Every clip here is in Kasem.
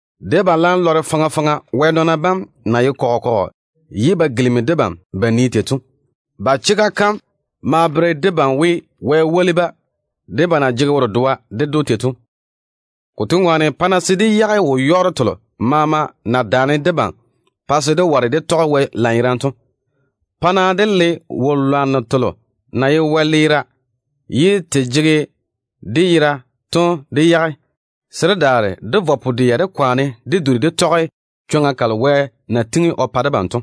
Debam laam lɔre faŋa faŋa Wɛ nɔɔna bam na ye kɔgɔ kɔgɔ ye ba gilimi debam ba nii tei to. Ba chega kam maa bere debam Wɛ na woli-ba tei, ba na jege wo-dedoa ded‑o to ŋwaane. Konto ŋwaane, pa-na se dé yage wo-yɔɔro telo maama na daane debam pa se dé ware dé tɔge Wɛ lanyerane to. Pa-na dé le wo-lwanno telo na ye wɛleera ye te jege dé yera to dé yage, se dé daare dé vɔ pu-dɛa dé kwaane dé duri dé tɔge chwoŋa kalo Wɛ na tiŋi o pa debam to.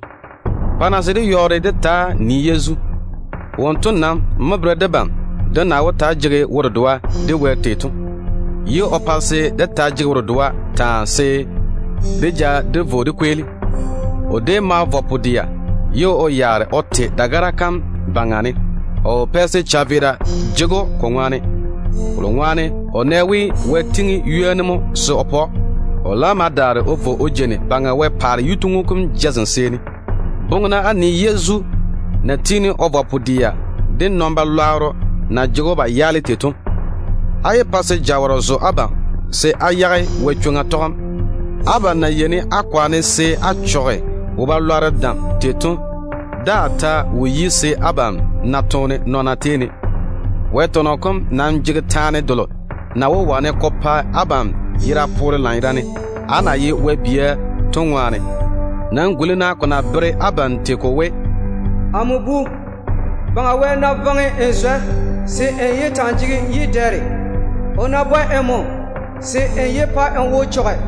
Pa-na se dé yɔɔre dé taa nii Yezu seeni. Wonto nam mo bere debam dé na wó taa jege wo-dedoa de Wɛ tei to, ye o pa se dé taa jege wo-dedoa taa, se dé ja dé vo dé kweeli. O déem vɔge pu-dɛa mo ye o yaare o te dagara kam yuu ne. O wo pɛ se chaveera ja‑o ko ŋwaane, kolo ŋwaane o nɛ we Wɛ tiŋi ywoni mo se o pa‑o. O laam ma daare o vo o jeini Baŋa Wɛ paare yituŋu kom jazem seeni. Boŋe-na á nii Yezu na tiini o vɔ pu-dɛa de nɔn-chechɔgero na jege‑o ba yaale tei to. Á yé pa se jawɔrɔ zo abam se á yage Wɛ chwoŋa tɔgem. Abam na yeini á kwaane se á chɔge wo-balwaaro dam tei to daa ta wo yi se á na toone nɔɔna tei ne. Wɛ tɔnɔ kom nam jege taane delo na wó wane ko pa abam yera poore lanyerane, á na ye Wɛ bia to ŋwaane. Nam guli-na ko na bere abam tei ko we: “Amo bu, Baŋa Wɛ ná jege‑m o koresa, se n sɛ koresem. O maa ná bwɛ nmo, se n yé pa n nagwola te.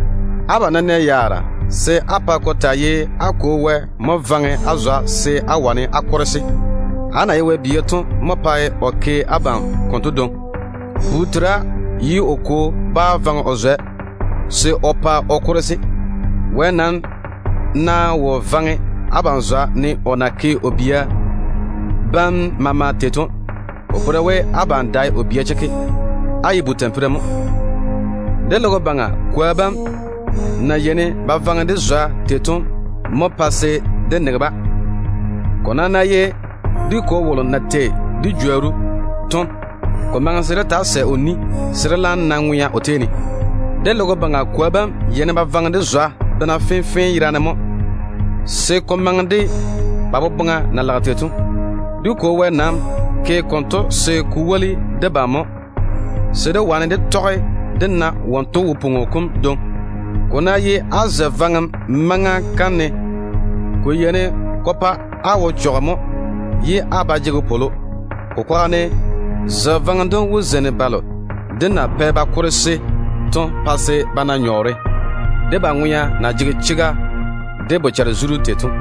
Abam ná nɛ yaara, se á pa ko taa ye á Kwo Wɛ mo korese abam o de chwoŋa ne. Á na ye Wɛ bia to mo pae o ke abam konto dwoŋi. Bu tera ye o kwo bá vaŋe o zwɛ se o pa o korese. Wɛ nam ná wo korese abam ne o na ke o bia bam maama tei to, ko bere we abam dae o bia chekke, á ye tampira mo. Dé logo baŋa kwoa bam na yeini ba vaŋe dé zwa tei to mo pae se dé nege-ba. Ko nam ná ye dé Kwo wolo na tei dé jworru to, ko maŋe se dé taa sɛ o ni se dé laam na ŋwea o tei ne. Dé logo baŋa kwoa bam yeini ba vaŋe dé zwa bena fenfee yerane mo se ko maŋe de ba boboŋa na lage tei to. Dé Kwo Wɛ nam ke konto se ko woli debam mo, se dé wane dé tɔge dé taa ye wose, ne wonto na ye tei to. Ko ná ye á koresem maŋa kam ne, ko yeini ko pa á wo chɔge mo ye á ba jege wopwolo. Ko kwaga ne, zwɛ vaŋem dem wó zeini balo de na pɛ ba korese to pa se ba na nyɔɔre, de ba ŋwea na jege chega de bochare-zuru tei to.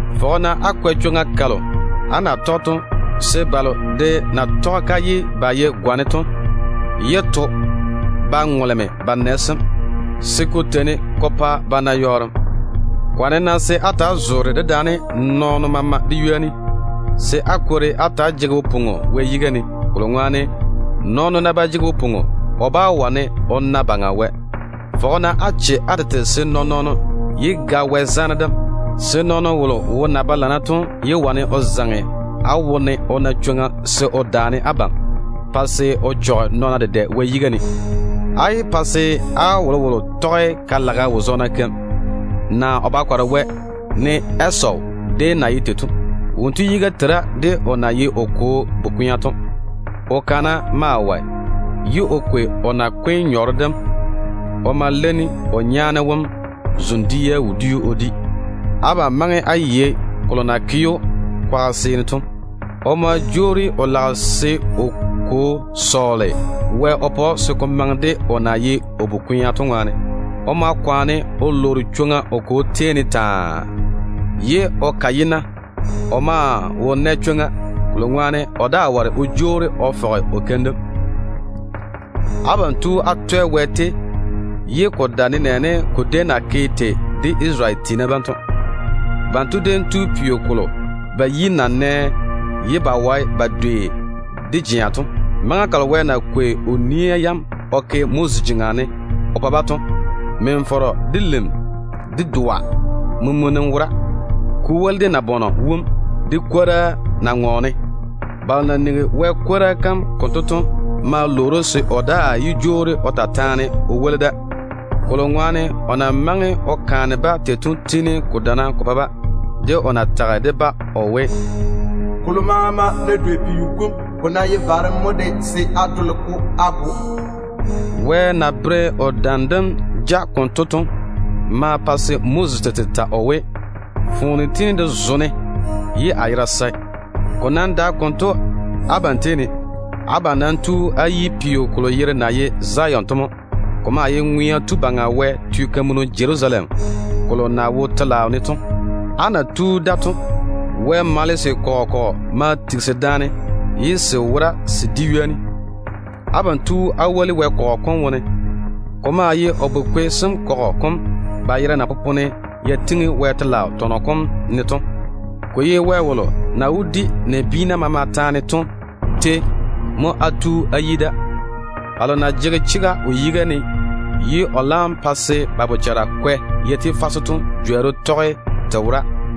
Fɔge-na á kwɛ chwoŋa kalo á na wó tɔge to se balo de na tɔge-ka ye ba ye gwane to yé to ba ŋoleme ba nɛ sem, se ko nam pa ba na yɔɔrem. Kwaane-na se á ta‑á zoore dedaane nɔɔno maama de ywoni, se á kwori á ta‑á jege wo-pwoŋo Wɛ yiga ne, kolo ŋwaane, nɔɔno ná ba jege wo-pwoŋo, o bá wane o na dé Teiru Wɛ. Fɔge-na á che á tete se nɔɔn-nɔɔno yé ga Wɛ zaane dem. Yé yage-na chwoŋa se nɔɔno wolo wo na ba lana to zaŋe á wone ye o daane abam pa se abam dedɛ na chɔgem Wɛ yiga ne. Á yé pa se á wolowolo taa ye ka-lageno, naa Wɛ-lwɛɛno ne Esawu déem na ye tei to. Wonto yiga tera de o na ye o kwo bu-kwea to. O kana maa wɔe, ye o kwei o nakwe nyɔɔre dem o ma leini o nyaane wom zoŋ-dia wodiu o di. Abam maŋe á yei kolo na ke‑o kwaga seeni to. O ma jwoori o lage se o kwo sɔɔle Wɛ swolim o pa‑o, se ko maŋe de o na ye o bu-kwea to ŋwaane. O ma kwaane o lwoori chwoŋa o kwo tei ne taa, ye o ka yi-na. O maa wo nɛ chwoŋa, kolo ŋwaane o daa ware o jwoori o fɔge o keim dem. Abam nam tu á twɛ Wɛ, ye ko dae nenɛɛne ko déem na ke tei de Isarele tiina bam to. Banto déem tu peo kolo ba yi na nɛ ye ba wae ba dwei de jea to. Maŋa kalo Wɛ na kwei o nia yam o ke Moses jeŋa ne o pa-ba to, min-fɔrɔ, de lim, de doa mumunim wora, ko woli de nabɔnɔ wum, de kwora na ŋɔɔne. Balo na nigi Wɛ kwora kam konto to ma lwoori‑o se o daa yé jwoori o ta taane o woli da, kolo ŋwaane o na maŋe o kaane-ba tei to tiini ko dana ko pa-ba, de o na tage de-ba o we, “Kolo maama ná nɔne peo kom baŋa ne, ko ná ye varem mo de, se á dole-ko á go.” Wɛ na bere o dam dem ja konto to ma pa se Moses tete ta o we, “Foone tiini de zo-ne ye a yera sae.” Ko nam dae konto abam tei ne. Abam nam tu á yi peo kolo yere na ye Zion to mo. Ko maa ye Ŋwea Tu Baŋa Wɛ teo Jerusalem kolo na wo telaao ne to. Á na tu da to, Wɛ malese morro kɔgɔ kɔgɔ ma tigisi daane ye se wora se di ywoni. Abam tu á woli Wɛ kɔgɔ kom wone. Ko maa ye o bu-kwe sem kɔgɔ kom, ba yera na popone ya tiŋi Wɛ telaao tɔnɔ kom ne to. Ko ye Wɛ wolo na wó di nabiina maama taane to tei mo á tu á yi da. Balo na jege chega o yiga ne ye o laam pa se ba bochara kwɛ ya ti fase to jworru maa wo o tei ne.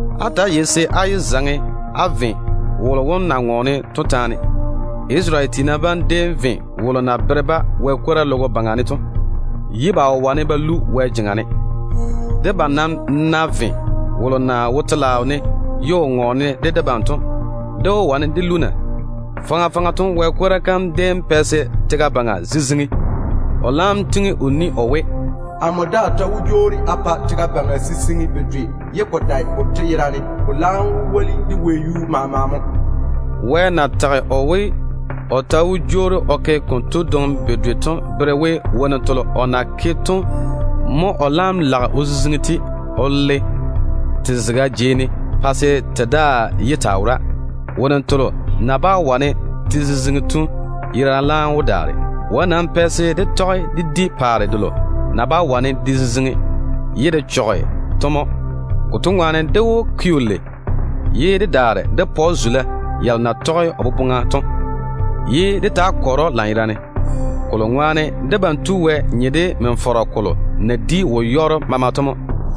Ta‑á yei-na se á yé zaŋe á ve wolo wom na ŋɔɔne to taane. Isarele tiina bam déem ve wolo na bere-ba Wɛ kwora logo baŋa ne to, ye ba wo wane ba lu Wɛ jeŋa ne. Debam nam ná ve wolo na wo telaao ne ye o ŋɔɔne de debam to, dé wó wane dé lu na? Faŋa faŋa to Wɛ kwora kam déem pɛ se tega baŋa maama ziziŋi. O laam nam pwooli we: “Amo daa ta wó jwoori a pa tega kam ziziŋi bedwe, ye ko dae kanto yerane, ko laam wó woli de wɛyuu kom maama mo.” Wɛ na tage o we, o ta wó jwoori o ke konto dwoŋi bedwe to bere we, wonnu telo o na naane to mo o laam lage o ziziŋi o le te zega jei ne, pa se te daa yé taa wora. Wonnu telo na bá wane te ziziŋi to yerane laam wó daare. Wɛ nam pɛ se dé tɔge dé di paare delo na bá wane de ziziŋi to mo. Konto ŋwaane dé wó ke‑o lei. Dé maa wó pa‑o zula yalo na tɔge o boboŋa to, ye dé taa kɔre‑o lanyerane, kolo ŋwaane debam Tu Wɛ nye de min-fɔrɔ kolo na di wo-yɔɔro maama to mo.